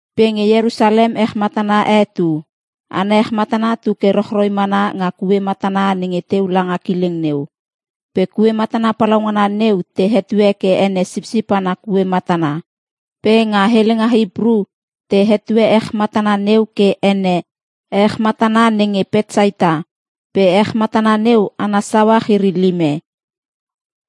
Pe nge Ierusalem ech matana e tu. Ana ech matana tu ke rochroi mana nga kue matana nenge teu langa kileng neu. Pe kue matana palaungana neu te hetue ke ene Sipsip ana Kue Matana. Pe nga helenga Hipru te hetue ech matana neu ke ene, ech matana nenge Petsaita pe ech matana neu ana sauach iri lime.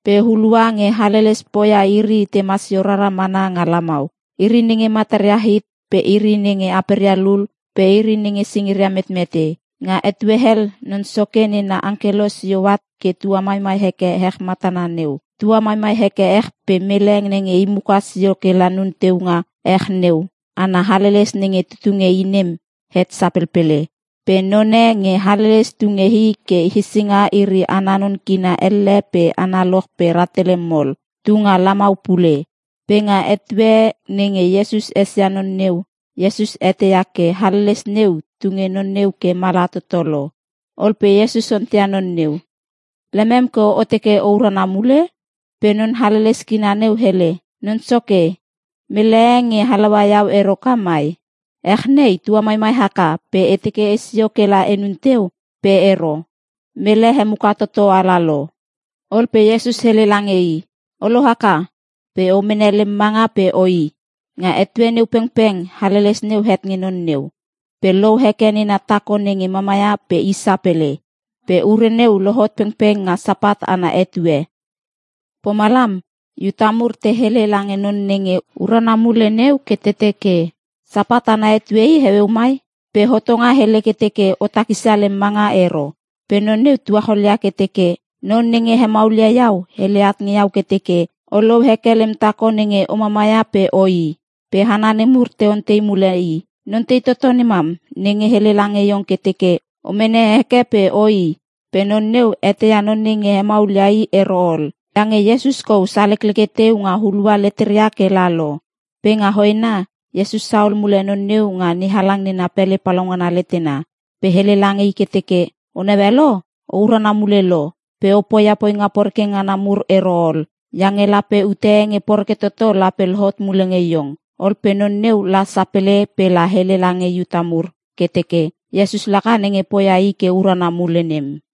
Pe hulua nge haleles poia iri tema sio rara mana nga lamau. Iri nenge mataria hit pe iri nenge aperia lul pe iri nenge singiria metmete. [Nga etue hel Non Soke nena angkelo sio at ke tua maimai heke ech nga ech matana neu. Tua maimai heke ech pe mele nenge i muka sio kela nun teu nga ech neu, ana haleles nenge tutu nge i nem het sapelpele.] Pe none nge haleles tu nge i ke hesinga iri ana non kina elle pe analoch pe rahtele mol(38), tu nga lamau pule. Pe nga etue nenge Iesus esia non neu, Iesus eteia ke haleles neu tunge non neu ke mala toto lo. Ol pe Iesus onteia non neu, “Lemem ke o teke o urana mule?” Pe non haleles kina neu hele, “Non Soke, mele e nge halaua iau ero ka mai. Ech nei tua maimai haka pe e teke esio kela enun teu pe ero, mele hemuka toto ala lo.” Ol pe Iesus hele lange i, “O lohaka! Pe o mene lem manga pe oi.” Nga etue neu pengpeng haleles neu het nge non neu, pe lou heke nena tako nenge mamaia pe i sapele. Pe ure neu lohot pengpeng nga Sapat ana etue. Pomalam Iuta mur te hele lange non nenge urana mule neu ke te teke, “Sapat ana etue i heueu mai. Pe hotonga hele ke teke o takisia lem manga ero.” Pe non neu tuacholia ke teke, “Non nenge hemaulia iau hele at nge iau ke teke, ‘O lou heke lem tako nenge o mama ia pe oi.’” Pe hana nemur te ontei mule i, “Non tei toto nemam, nenge hele lange iong ke teke o mene heke pe oi?” Pe non neu eteia non nenge hemaulia i ero ol, iange Iesus kou salekleke teu nga hulua leteria kela lo. Pe nga hoena, Iesus sahol mule non neu nga NeHalang na pele palaungana letena. Pe hele lange i ke teke, “O naue lo, o urana mule lo. Pe o poia poinga porekreke ngana mur ero ol, iange lape ute e nge poreke toto lape lohot mule nge iong.” Ol pe non neu la sapele pela hele lange Iuta mur ke teke Iesus laka nenge poia i ke urana mule nem.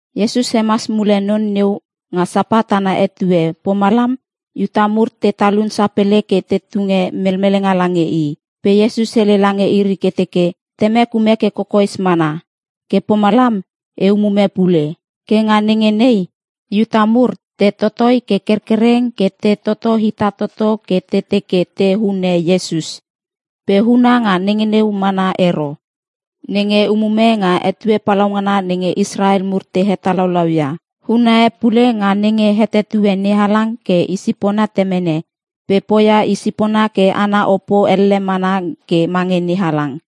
Iesus hemas mule non neu nga Sapat ana etue pomalam Iuta mur te talun sapele ke te tunge melmelenga lange i. Pe Iesus hele lange iri ke teke, “Temek ume ke kokoes mana, ke pomalam e umume pule.” Ke nga nenge nei, Iuta mur te totoi ke kerkereng ke te toto hita toto ke te teke te hune Iesus. Pe huna nga nenge neu mana ero. Nenge umume nga etue palaungana nenge Israel mur te hetalaulau ia. Huna e pule nga nenge hetetue NeHalang ke i sipona Temene, pe poia i sipona ke ana opo elle mana ke mange NeHalang.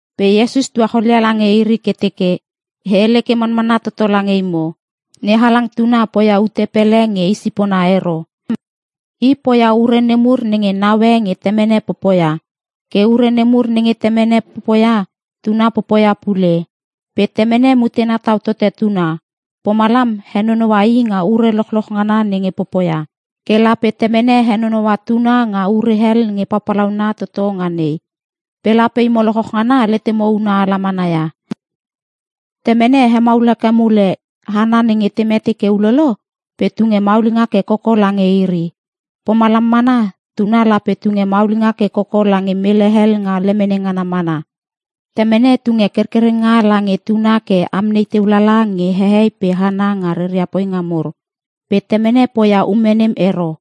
Pe Iesus tuacholia lange iri ke teke, “E hele ke manmanna toto lange imo, NeHalang Tuna poia ute pele nge i sipona ero. I poia ure nemur nenge naue nge Temene popoia. Ke ure nemur nenge Temene popoia, Tuna popoia pule. Pe Temene mutena tau tote Tuna, pomalam henonoua i nga ure lochloch ngana nenge popoia. Ke lape Temene henonoua Tuna nga ure hel nge papalauna toto nga nei, pe lape imo lochloch ngana letemo una ala mana ia. Temene hemaul heke mule hana nenge te mete ke ulolo pe tunge maulinga ke koko lange iri. Pomalam mana, Tuna lape tunge maulinga ke koko lange mele hel nga lemene ngana mana. Temene tunge kerkerenga lange Tuna ke amnei teu lala nge hehei pe hana nga reria poinga mur. Pe Temene poia ume nem ero.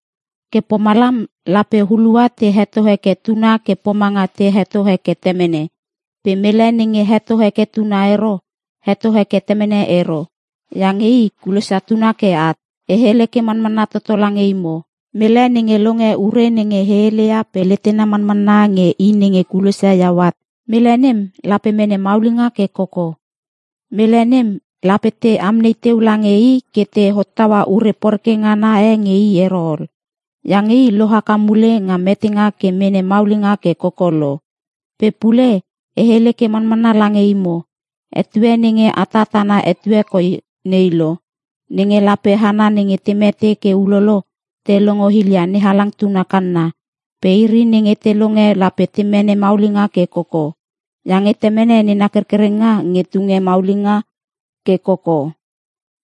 Ke pomalam lape hulua te heto heke Tuna ke pomanga te heto heke Temene. Pe mele nenge heto heke Tuna ero, heto heke Temene ero, iange i kulosia Tuna ke at. “E hele ke manmanna toto lange imo, mele nenge longe ure nenge e heleia pe letena manmanna nge i nenge kulosia iau at, mele nem lape mene maulinga ke koko. Mele nem lape te amnei teu lange i ke te hottaua ure poreke ngana e nge i ero ol. Iange i lohaka mule nga metenga ke mene maulinga ke koko lo. Pe pule e hele ke manmanna lange imo, etue nenge atat ana etue koi nei lo nenge lape hana nenge te mete ke ulolo te longo hilia NeHalang Tuna kanna. Pe iri nenge te longe lape te mene maulinga ke koko. Iange Temene nena kerkerenga nge tunge maulinga ke koko.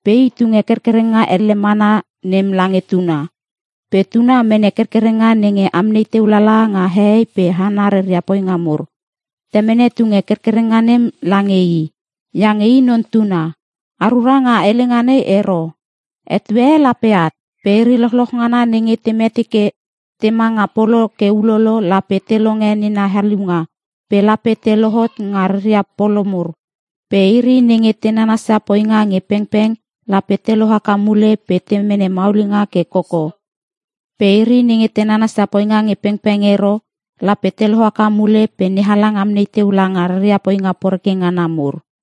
Pe i tunge kerkerenga elle mana nem lange Tuna. Pe Tuna mene kerkerenga nenge amnei teu lala nga hehei pe hana reria poinga mur. Temene tunge kerkerenga nem lange i, iange i Non Tuna. A rura nga helenga nei ero: Etue e lape at. Pe iri lochloch ngana nenge te mete ke tema nga polo ke ulolo lape te longe nena haliunga pe lape te lohot nga reria polo mur. Pe iri nenge te nanasia poinga nge pengpeng lape te lohaka mule pe te mene maulinga ke koko. Pe iri nenge te nanasia poinga nge pengpeng ero, lape te lohaka mule pe NeHalang amnei teu langa reria poinga poreke ngana mur.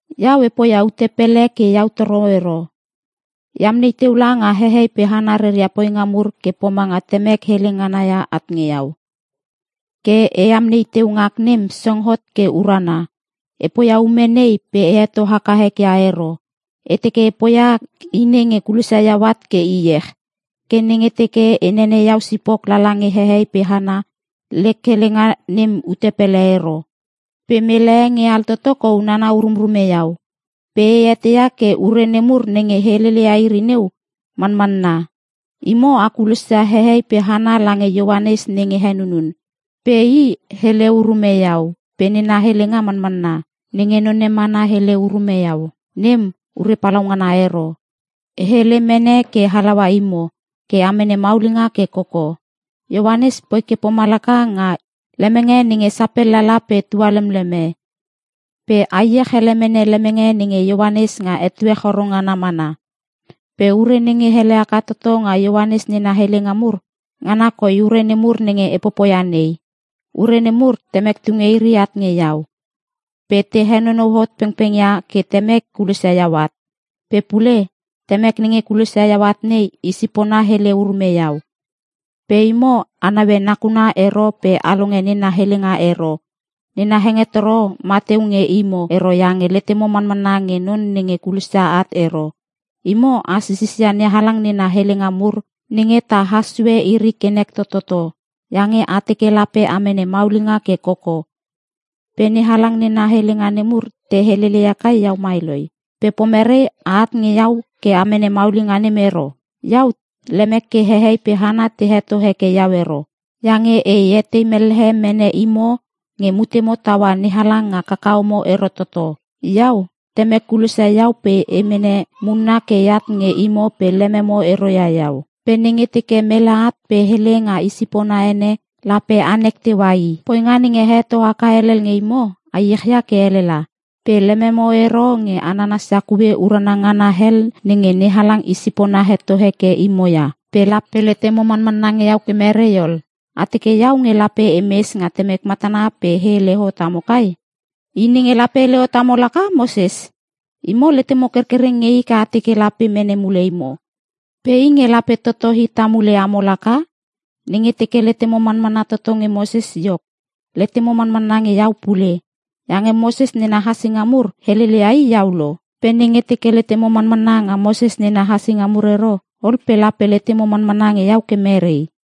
“Iau e poia ute pele ke iau toro ero. E amnei teu langa hehei pe hana reria poinga mur ke pomanga Temek hele ngana ia at nge iau. Ke e amnei teu ngak nem song hot ke urana. E poia ume nei pe e heto haka ek ia ero. E teke e poia i nenge kulosia iau at ke iech. “Ke nenge teke e nenene iau sipok lala nge hehei pe hana, lek helenga nem ute pele ero. Pe mele e nge altoto kou nana urumrume iau. Pe e eteia ke ure nemur nenge heleleia iri neu, manmanna. “Imo, a kulosia hehei pe hana lange Ioanes nenge henunun. Pe i hele urume iau pe nena helenga manmanna. Nenge none mana hele urume iau, nem ure palaungana ero. E hele mene ke halaua imo ke a mene maulinga ke koko. Ioanes poi ke pomalaka nga lemenge nenge sapel lala pe tualemleme. Pe a iech ele mene lemenge nenge Ioanes nga etue choro ngana mana. “Pe ure nenge ele haka toto nga Ioanes nena helenga mur, ngana koi ure nemur nenge e popoia nei. Ure nemur Temek tunge iri at nge iau, pe te henonou hot pengpeng ia ke Temek kulosia iau at. Pe pule, Temek nenge kulosia iau at nei, i sipona hele urume iau. Pe imo, a naue nakuna ero pe a longe nena helenga ero. Nena hengetoro ma teu nge imo ero iange letemo manmanna nge non nenge kulosia at ero. Imo a sisisia NeHalang nena helenga mur nenge ta has sue iri ke nek tototo, iange a teke lape a mene maulinga ke koko. Pe NeHalang nena helenga nemur, te helele ia kai iau mai loi! Pe pomerei a at nge iau ke a mene maulinga nem ero? “Iau lemek ke hehei pe hana te heto heke iau ero. Iange e etei mellehe mene imo nge mutemo taua NeHalang nga kakahomo ero toto. Iau, Temek kulosia iau pe e mene munna ke eat nge imo pe lememo ero ia iau. Pe nenge teke mele at pe hele nga i sipona ene, lape anek teua i. Poinga nenge a heto haka helel nge imo a iech ia ke elela. Pe lememo ero nge a nansia kue urana ngana hel nenge NeHalang i sipona heto heke imo ia. Pe lape letemo manmanna nge iau ke merei ol? A teke iau nge lape emes nga Temek matana pe e hele hot amo kai? I nenge lape hele hot amo laka Moses. Imo letemo kerkereng nge i ke a teke lape mene mule imo. Pe i nge lape toto hita mule amo laka. Nenge teke letemo manmanna toto nge Moses iok, letemo manmanna nge iau pule. Iange Moses nena hassinga mur helele ia i iau lo. Pe nenge teke letemo manmanna nga Moses nena hassinga mur ero, ol pe lape letemo manmanna nge iau ke mere?”